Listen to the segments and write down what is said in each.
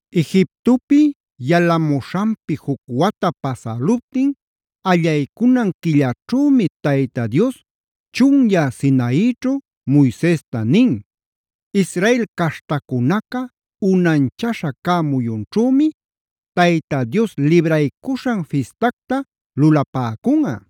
Egiptopi yalamuśhanpi juc wata pasäluptin, allaycunan quilläćhümi Tayta Dios chunyä Sinaićhu Moisesta nin: “Israel caśhtacunaca unanchaśha cä muyunćhümi Tayta Dios Libraycuśhan Fistacta lulapäcunꞌa.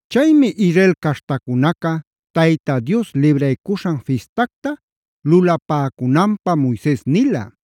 Chaymi Israel caśhtacunaca Tayta Dios Libraycuśhan Fistacta lulapäcunanpä Moises nila.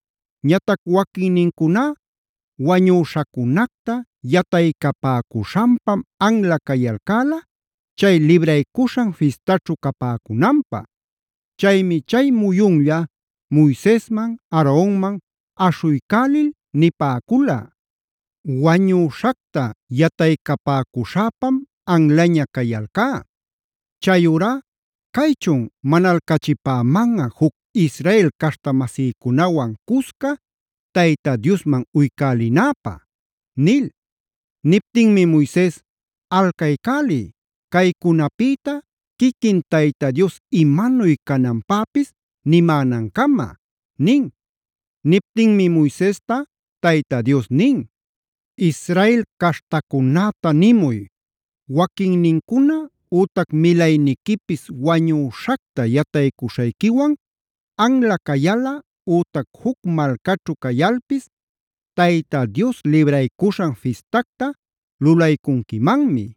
Ñatac waquinnincuná wañüśhacunacta yataycapäcuśhanpam anla cayalcäla, chay Libraycuśhan Fistaćhu capäcunanpä. Chaymi chay muyunlla Moisesman, Aaronman aśhuycälil nipäcula: “Wañüśhacta yataycapäcuśhäpam anlaña cayalcá. Chayurá ¿caychun manalcachipämanꞌa juc Israel caśhta-masïcunawan cusca Tayta Diosman uycälinäpä?” nil. Niptinmi Moises: “Alcaycäliy, caycunapïta quiquin Tayta Dios imanuy cananpäpis nimänancama” nin. Niptinmi Moisesta Tayta Dios nin: “Israel caśhtacunäta nimuy: ‘Waquinnincuna ütac milayniquipis wañüśhacta yataycuśhayquiwan anla cayalꞌa ütac juc malcaćhu cayalpis Tayta Dios Libraycuśhan Fistacta lulaycunquimanmi.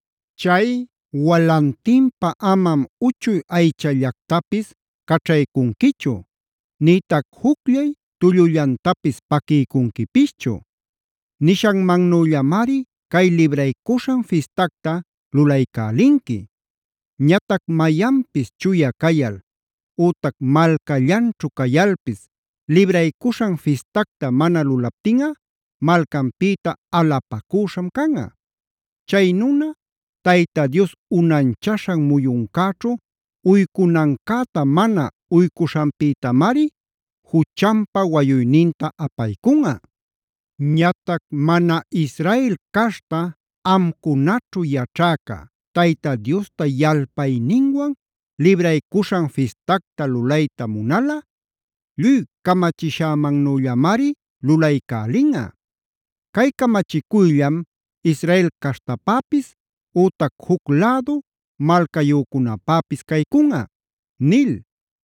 Chay walantinpä amam uchuy aychallactapis caćhaycunquichu, nïtac jucllay tullullantapis paquiycunquipischu.b Nishanmannüllamari cay Libraycuśhan Fistacta lulaycälinqui. “ ‘Ñatac mayanpis chuya cayal, ütac malcallanćhu cayalpis Libraycuśhan Fistacta mana lulaptinꞌa, malcanpïta alapacüśham canꞌa. Chay nuna Tayta Dios unanchaśhan muyuncäćhu uycunancäta mana uycuśhanpïtamari juchanpa wayuyninta apaycunꞌa. “ ‘Ñatac mana Israel caśhta amcunaćhu yaćhäca Tayta Diosta yalpayninwan Libraycuśhan Fistacta lulayta munalꞌa, lluy camachishämannüllamari lulaycälinꞌa. Cay camachicuyllam Israel caśhtapäpis ütac juc lädu malcayücunäpäpis caycunꞌa’”c nil.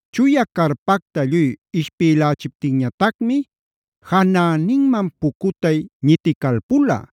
Chuya carpacta lluy ishpïlächiptinñatacmi janäninman pucutay ñiticalpula;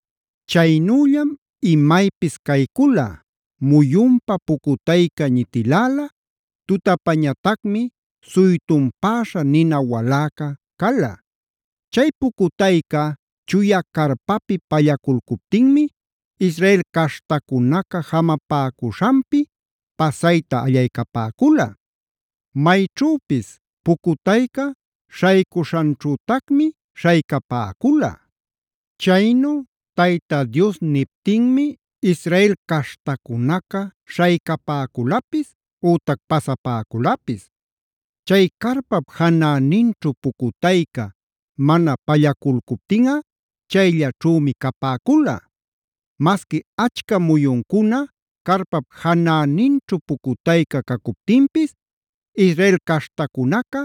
Chaynüllam imaypis caycula: muyunpa pucutayca ñitiläla, tutapañatacmi suytunpäśha nina waläca cala. Chay pucutayca chuya carpapi pallaculcuptinmi Israel caśhtacunaca jamapäcuśhanpi pasayta allaycapäcula. Mayćhüpis pucutayca śhaycuśhanćhütacmi śhaycapäcula. Chaynu Tayta Dios niptinmi Israel caśhtacunaca śhaycapäculapis ütac pasapäculapis. Chay carpap janäninćhu pucutayca mana pallaculcuptinꞌa chayllaćhümi capäcula. Masqui achca muyuncuna carpap janäninćhu pucutayca cacuptinpis Israel caśhtacunaca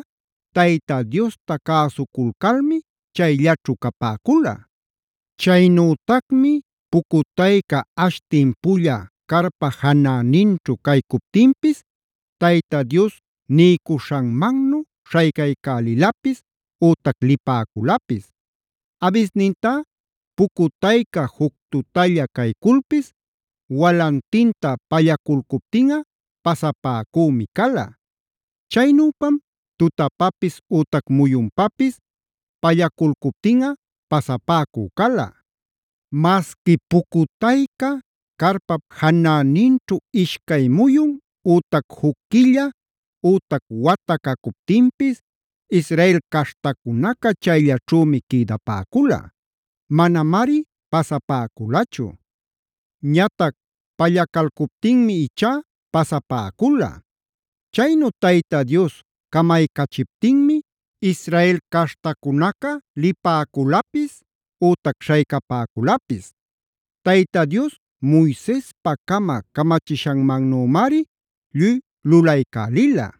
Tayta Diosta cäsuculcalmi chayllaćhu capäcula. Chaynütacmi pucutayca ash timpulla carpa janäninćhu caycuptinpis Tayta Dios niycuśhanmannu śhaycaycälilapis ütac lipäculapis. Abisnintá pucutayca juc tutalla cayculpis walantinta pallaculcuptinꞌa pasapäcümi cala. Chaynüpam tutapapis ütac muyunpapis pallaculcuptinꞌa pasapäcü cala. Masqui pucutayca carpap janäninćhu ishcay muyun, ütac juc quilla, ütac wata cacuptinpis Israel caśhtacunaca chayllaćhümi quïdapäcula; manamari pasapäculachu. Ñatac pallacalcuptinmi ichá pasapäcula. Chaynu Tayta Dios camaycachiptinmi Israel caśhtacunaca lipäculapis ütac śhaycapäculapis. Tayta Dios Moisespacama camachishanmannümari lluy lulaycälila.